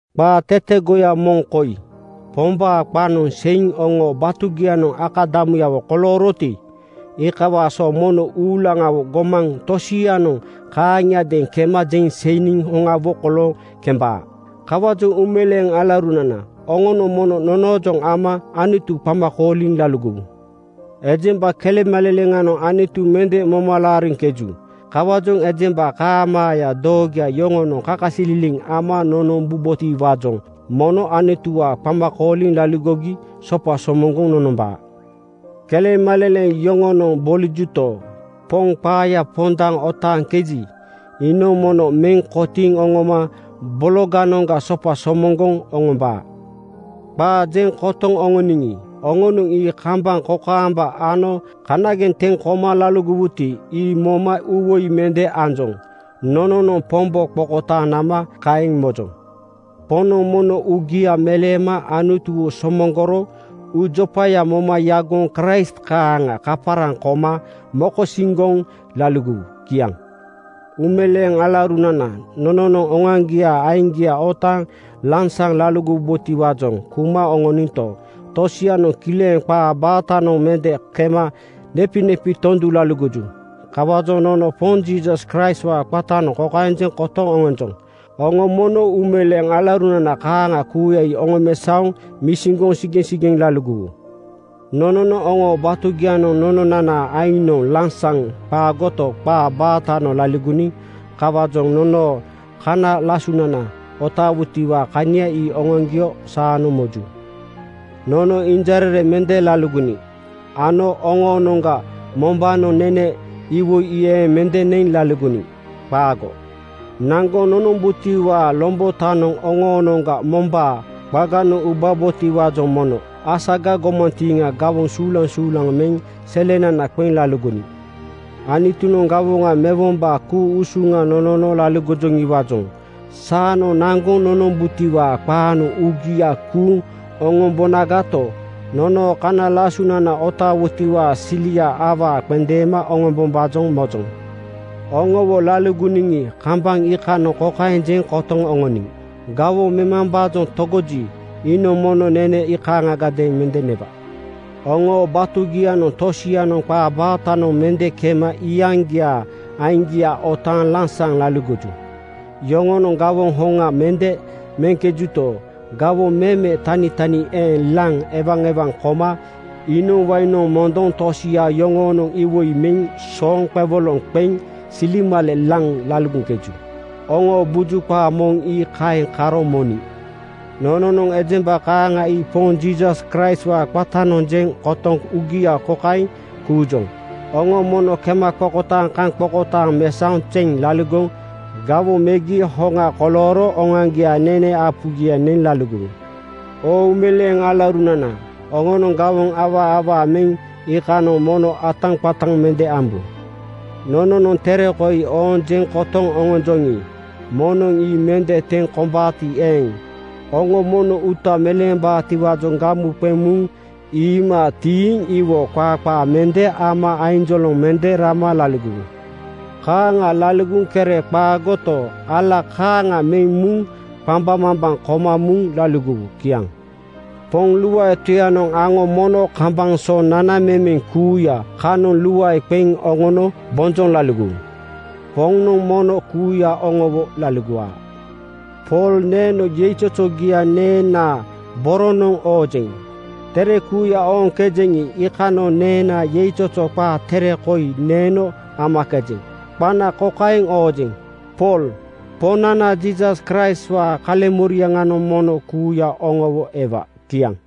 Qaa tetegoya moŋ koi: Pombaa qaanoŋ seiŋ oŋoo batugianoŋ akadamuyawo kolooroti, iikawaa so mono uulaŋawo gomaŋ tosianoŋ kaaŋiadeeŋ kema jeŋ seiniŋ hoŋawo kolooŋ kembaa. Kawaajoŋ uumeleeŋ alaurunana, oŋonoŋ mono nonoojoŋ ama Anutu qama kooliŋ laligowu. Ejemba kelemaleleŋanoŋ Anutu mende moma laariŋkeju. Kawaajoŋ ejemba kaamaaya doogoya yoŋonoŋ kakasililiŋ ama nonombubotiwaajoŋ mono Anutuwaa qama kooliŋ laligogi sopa somoŋgoŋ nonombaa. Kelemaleleŋ yoŋonoŋ bolijuto, Poŋ qaaya pondaŋ otaaŋkeji, iinoŋ mono meŋ kotiiŋ oŋoma bologanoŋga sopa somoŋgoŋ oŋombaa. Qaa jeŋ kotoŋ oŋoniŋi, oŋonoŋ ii kambaŋ kokaamba ano kanageŋ teŋ koma laligowuti, ii moma uuwoi mende anjoŋ. Nononoŋ Pombo qokotaaŋ nama kaeŋ mojoŋ. Poŋnoŋ mono uugia meleema Anutuwo somoŋgoro uujopaya moma yagoŋ Kraist kaaŋa kaparaŋ koma mokosiŋgoŋ laligowu. Kiaŋ. Uumeleeŋ alaurunana, nono oŋoaŋgiaa aiŋgia otaaŋ lansaŋ laligowubotiwaajoŋ kuma oŋoninto, tosianoŋ kileŋ qaa baatanoŋ mende kema nepinepi tondu laligoju. Kawaajoŋ nono Poŋ Jiisas Kraistwaa qatanoŋ kokaeŋ jeŋ kotoŋ oŋonjoŋ: Oŋo mono uumeleeŋ alaurunana kaaŋa kuuya ii oŋomesaoŋ misiŋgoŋ sigeŋsigeŋ laligowu. Nononoŋ oŋoo batugianoŋ nononanaa aiŋnoŋ lansaŋ qaagoto, qaa baatanoŋ laligoniŋ. Kawaajoŋ nonoo kana lasunana otaawutiwaa kania ii oŋoaŋgio saanoŋ moju. Nono injarere mende laligoniŋ ano oŋoonoŋga mombaanoŋ nene iwoi ii eeŋ mende neŋ laligoniŋ. Qaago. Naŋgoŋ nonombutiwaa lombotanoŋ oŋoonoŋga mombaa qaganoŋ ubabotiwaajoŋ mono asaga gomantiiŋa gawoŋ suulaŋsuulaŋ meŋ selenana qeŋ laligoniŋ. Anutunoŋ gawoŋa mewombaa ku-usuŋa nonono laligojoŋiwaajoŋ saanoŋ naŋgoŋ nonombutiwaa qaanoŋ uugia kuuŋ oŋombonagato, nonoo kana lasunana otaawutiwaa sili awaa qendeema oŋombombaajoŋ mojoŋ. Oŋowo laligoniŋi, kambaŋ iikanoŋ kokaeŋ jeŋ kotoŋ oŋoniŋ: Gawoŋ memambaajoŋ togoji, iinoŋ mono nene kaaŋagadeeŋ mende newa. Oŋoo batugianoŋ tosianoŋ qaa baatanoŋ mende kema iyaŋgiaa aiŋgia otaaŋ lansaŋ laligoju. Yoŋonoŋ gawoŋ hoŋa mende meŋkejuto, gawoŋ meme tanitani eeŋ laŋ ewaewaŋ koma iinoŋ wainoŋ mondoŋ tosia yoŋoonoŋ iwoi meŋ sooŋ qewoloŋ qeŋ silemale laŋ laligoŋkeju. Oŋoo buju qaa moŋ ii kaeŋ karo moniŋ. Nononoŋ ejemba kaaŋa ii Poŋ Jiisas Kraistwaa qatanoŋ jeŋ kotoŋ uugia kokaeŋ kuujoŋ: Oŋo mono kemaqokotaaŋkaŋqokotaaŋ mesaoŋ zeŋ laligoŋ gawoŋ megi hoŋa kolooro oŋoaŋgiaa nene apugia neŋ laligowu. Oo uumeleeŋ alaurunana, oŋonoŋ gawoŋ awaa awaa meŋ iikanoŋ mono ataqataŋ mende ambu. Nononoŋ tere koi ooŋ jeŋ kotoŋ oŋonjoŋi, moŋnoŋ ii mende teŋ kombaati eeŋ, oŋo mono uuta meleembaatiwaajoŋ gamu qeŋ muŋ iima tiiŋ iwo qaa qaa mende ama ainjoloŋ mende rama laligowu. Kaaŋa laligoŋ kere qaagoto, ala kaaŋa meŋ muŋ qambaŋmambaŋ koma muŋ laligowu. Kiaŋ. Poŋ luae Toyanoŋ aŋo mono kambaŋ so nanamemeŋ kuuya kanoŋ luae qeŋ oŋono bonjoŋ laligowu. Poŋnoŋ mono kuuya oŋowo laligowa. Pool neeno yeizozogia neenaa boronanoŋ oojeŋ. Tere kuuya ooŋkejeŋi, iikanoŋ neenaa yeizozo qa tere koi neeno amakejeŋ. Qana kokaeŋ oojeŋ: Pool Poŋnana Jiisas Kraistwaa kaleŋmoriaŋanoŋ mono kuuya oŋowo ewa. Kiaŋ.